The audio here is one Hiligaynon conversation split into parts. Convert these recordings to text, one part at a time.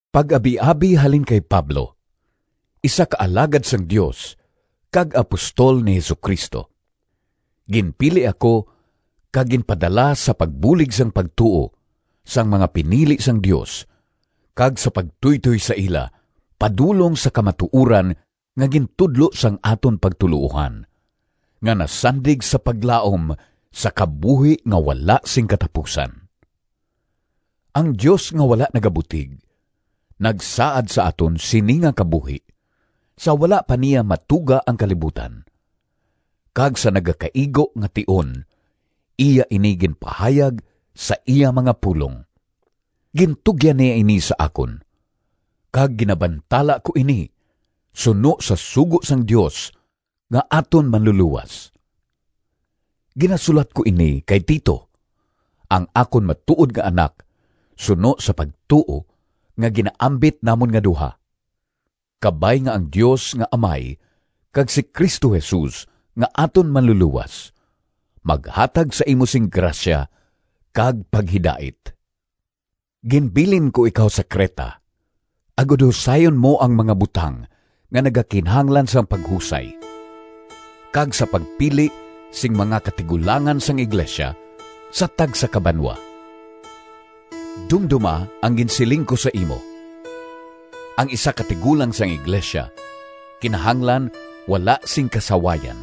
Pag-abiabi halin kay Pablo, isa ka alagad sang Dios kag apostol ni Jesu-Cristo. Ginpili ako kag ginpadala sa pagbulig sang pagtuo sang mga pinili sang Dios kag sa pagtuytoy sa ila padulong sa kamatuoran nga gintudlo sang aton pagtuloohan, nga nasandig sa paglaom sa kabuhi nga wala sing katapusan. Ang Dios nga wala nagabutig, nagsaad sa aton sini nga kabuhi, sa wala pa niya matuga ang kalibutan, kag sa nagakaigo nga tion iya ini ginpahayag sa iya mga pulong. Gintugyan niya ini sa akon, kag ginabantala ko ini suno sa sugo sang Dios nga aton Manlulowas. Ginasulat ko ini kay Tito, ang akon matuod nga anak suno sa pagtuo nga ginaambit namon nga duha. Kabay nga ang Dios nga Amay kag si Cristo Jesus nga aton Manlulowas maghatag sa imo sing grasya kag paghidait. Ginbilin ko ikaw sa Creta agod husayon mo ang mga butang nga nagakinahanglan sang paghusay, kag sa pagpili sing mga katigulangan sang iglesia sa tagsa ka banwa. Dumdoma ang ginsiling ko sa imo: ang isa ka tigulang sang iglesia kinahanglan wala sing kasawayan,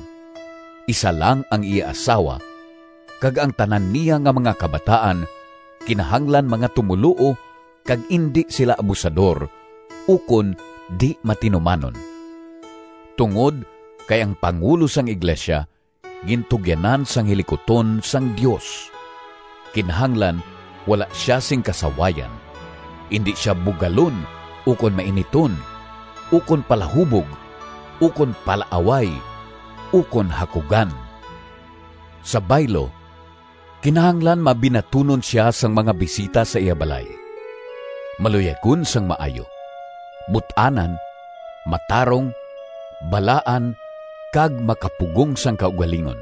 isa lang ang iya asawa, kag ang tanan niya nga mga kabataan kinahanglan mga tumoluo kag indi sila abusador ukon di-matinumanon. Tungod kay ang pangulo sang iglesia gintugyanan sang hilikuton sang Dios, kinahanglan wala sia sing kasawayan. Indi sia bugalon ukon mainiton, ukon palahubog, ukon palaaway, ukon hakugan. Sa baylo, kinahanglan mabinatunon sia sang mga bisita sa iya balay, maluyagon sang maayo, but-anan, matarong, balaan kag makapugong sang kaugalingon.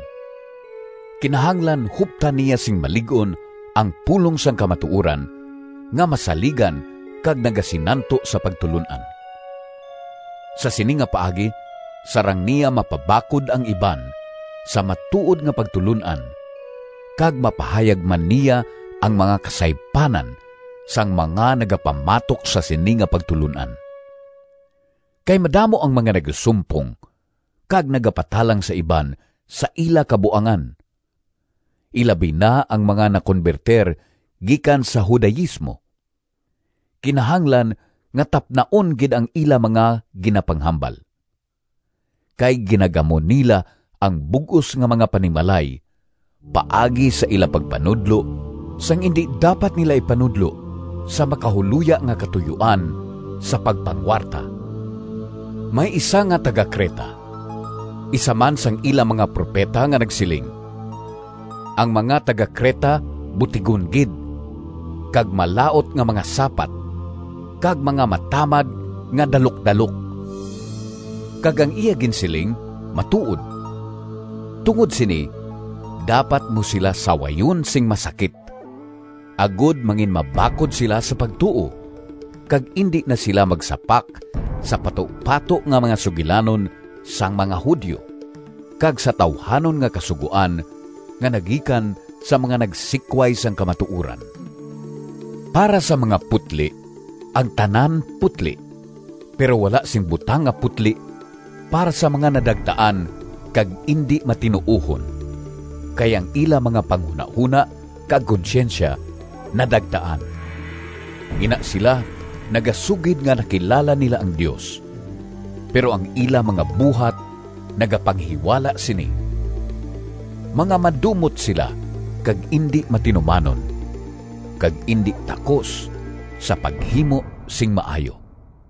Kinahanglan huptan niya sing malig-on ang pulong sang kamatuoran nga masaligan kag nagasinanto sa pagtulon-an. Sa sini nga paagi sarang niya mapabakod ang iban sa matuod nga pagtulon-an kag mapahayag man niya ang mga kasaypanan sang mga nagapamatok sa sini nga pagtulon-an. Kay madamo ang mga nagasumpong, kag nagapatalang sa iban sa ila kabuangan, ilabi na ang mga nakonbertir gikan sa Judaismo. Kinahanglan nga tapnaon gid ang ila mga ginapanghambal, kay ginagamo nila ang bug-os nga mga panimalay paagi sa ila pagpanudlo sang indi dapat nila ipanudlo, sa makahuloya nga katuyoan sa pagpangwarta. May isa nga taga-Creta, isa man sang ila mga propeta nga nagsiling, “Ang mga taga-Creta butigon gid, kag malaut nga mga sapat kag mga matamad nga dalukdalok.” Kag ang iya ginsiling matuod. Tungod sini dapat mo sila sawayon sing masakit, agod manginmabakod sila sa pagtuo, kag indi na sila magsapak sa patupato nga mga sugilanon sang mga Judio kag sa tawuhanon nga kasugoan nga nagikan sa mga nagsikway sang kamatuoran. Para sa mga putli ang tanan putli, pero wala sing butang nga putli para sa mga nadagtaan kag indi matinuohon, kay ang ila mga panghunahona kag konsyensya nadagtaan. Ina sila nagasugid nga nakilala nila ang Dios, pero ang ila mga buhat nagapanghiwala sini. Mga madumot sila kag indi matinumanon, kag indi takos sa paghimo sing maayo.